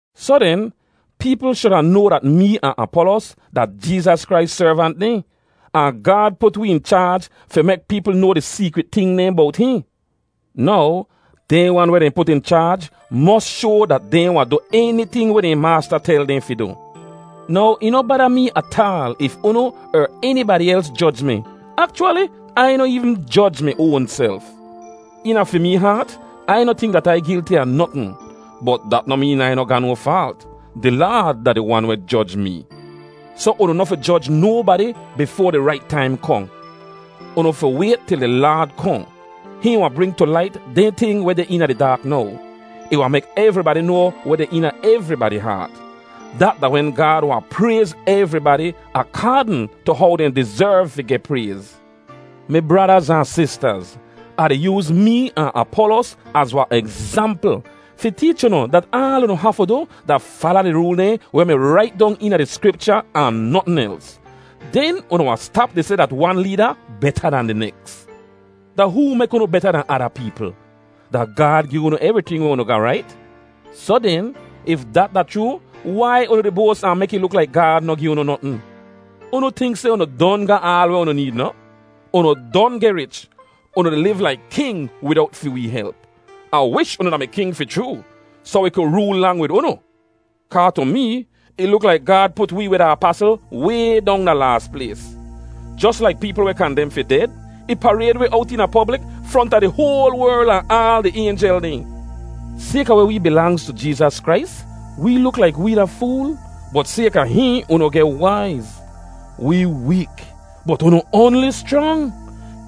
Soh den, peepl shuda noa dat mee ahn Apolos da Jeezas Krais servant dehn, ahn Gaad put wee in chaaj fi mek peepl noa di seekrit ting dehn bowt hihn. Now, dehn wan weh dehn put in chaaj mos shoa dat dehn wahn du eniting weh dehn maasta tel dehn fi du. Now ih noh bada mee ataal if unu er enibadi els joj mi. Akchwali, Ai noh eevn joj mi oanself. Eena fi mee haat Ai noh tink dat Ai gilti a notn. Bot dat noh meen Ai noh ga no faalt. Di Laad da di Wan weh joj mee. Soh unu noh fi joj nobadi bifoa di rait taim kohn. Unu fi wayt til di Laad kohn. Hihn wahn bring tu lait dehn ting weh deh eena di daak now. Ih wahn mek evribadi noa weh deh eena evribadi haat. Dat da wen Gaad wahn prayz evribadi akaadn tu how dehn dizerv fi geh prayz. Mi bradaz ahn sistaz, Ah di yooz mee ahn Apolos az wahn egzampl fi teech unu dat aal unu hafu du da “fala di rool dehn weh mi rait dong eena di Skripcha ahn notn els.” Den unu wahn stap di seh dat wan leeda beta dan di neks. Da hoo mek unu beta dan ada peepl? Da Gaad gi unu evriting weh unu ga, rait? Soh den, if dat da chroo, wai unu di boas ahn mek ih luk laik Gaad noh gi unu notn? Unu tink seh unu don ga aal weh unu need noh? Unu don geh rich! Unu di liv laik king widowt fi wee help. Ah wish unu da-mi king fi chroo, soh wi ku rool lang wid unu. Kaa tu mee ih luk laik Gaad put wee weh da apasl way dong da laas plays. Jos laik peepl weh kandem fi ded, ih parayd wi owt eena poblik fronta di hoal werl ahn aal di aynjel dehn. Sayka weh wee bilangz tu Jeezas Krais wee luk laik wee da fool, bot sayka hihn unu geh waiz. Wee week, bot unu oanli schrang!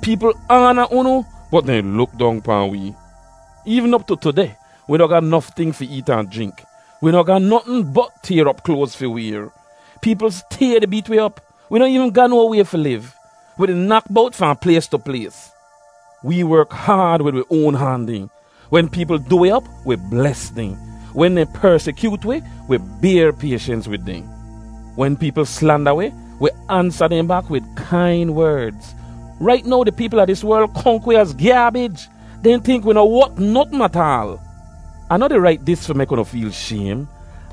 Peepl aana unu, bot dehn luk dong pahn wee. Eevn op tu tudeh, wi noh ga nof ting fi eet ahn jrink. Wi noh ga notn bot tayr op kloaz fi wayr. Peepl stay di beet wi op. Wi noh eevn ga no way fi liv. Wi di nak bowt fahn plays tu plays. Wee werk haad wid wi oan han dehn. Wen peepl du wi op, wi bles dehn. Wen dehn persikyoot wi, wi bayr payshens wid dehn. Wen peepl slanda wi, wi ansa dehn bak wid kain werdz. Rait now di peepl a dis werl konk wi az gyaabij. Dehn tink wi noh wot notn ataal! Ah noh di rait dis fi mek unu feel shaym.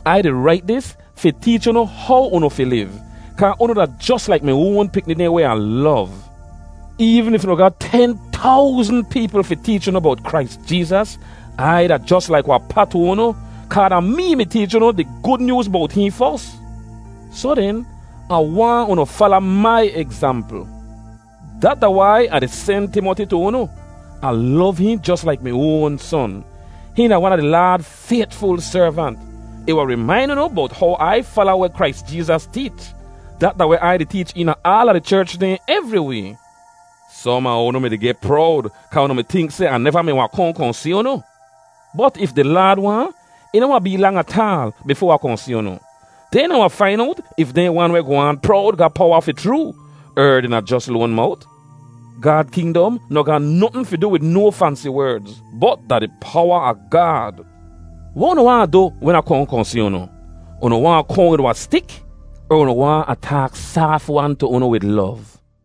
Ai di rait dis fi teech unu how unu fi liv, kaa unu da jos laik mi oan pikni dehn weh Ah lov. Eevn if unu ga ten towzn peepl fi teech unu bowt Krais Jeezas, Ai da jos laik wahn pa tu unu, kaa da mee mi teech unu di Gud Nyooz bowt hihn fos. Soh den, Ah waahn unu fala mai egzampl. Dat da wai Ah di sen Timoti tu unu. Ah lov hihn jos laik mi oan son. Hihn da wan a di Laad faytful servant. Ih wahn rimain unu bowt how Ai fala weh Krais Jeezas teech. Dat da weh Ai di teech eena aala di cherch dehn evriway. Som a unu mi-di geh prowd kaa unu mi tink seh Ah neva mi wahn kohn kohn si unu. Bot if di Laad waahn, ih noh wahn bee lang ataal bifoa Ah kohn si unu. Den Ah wahn fain owt if dehn wan weh goh aan prowd ga powa fi chroo, er dehn da jos loan mowt? Gaad kingdom noh ga notn fi du wid no fansi werdz, bot da di powa a Gaad. Weh unu waahn Ah du wen Ah kohn kohn si unu? Unu waahn Ah kohn wid wahn stik, er unu waahn Ah taak saaf-wan tu unu wid lov?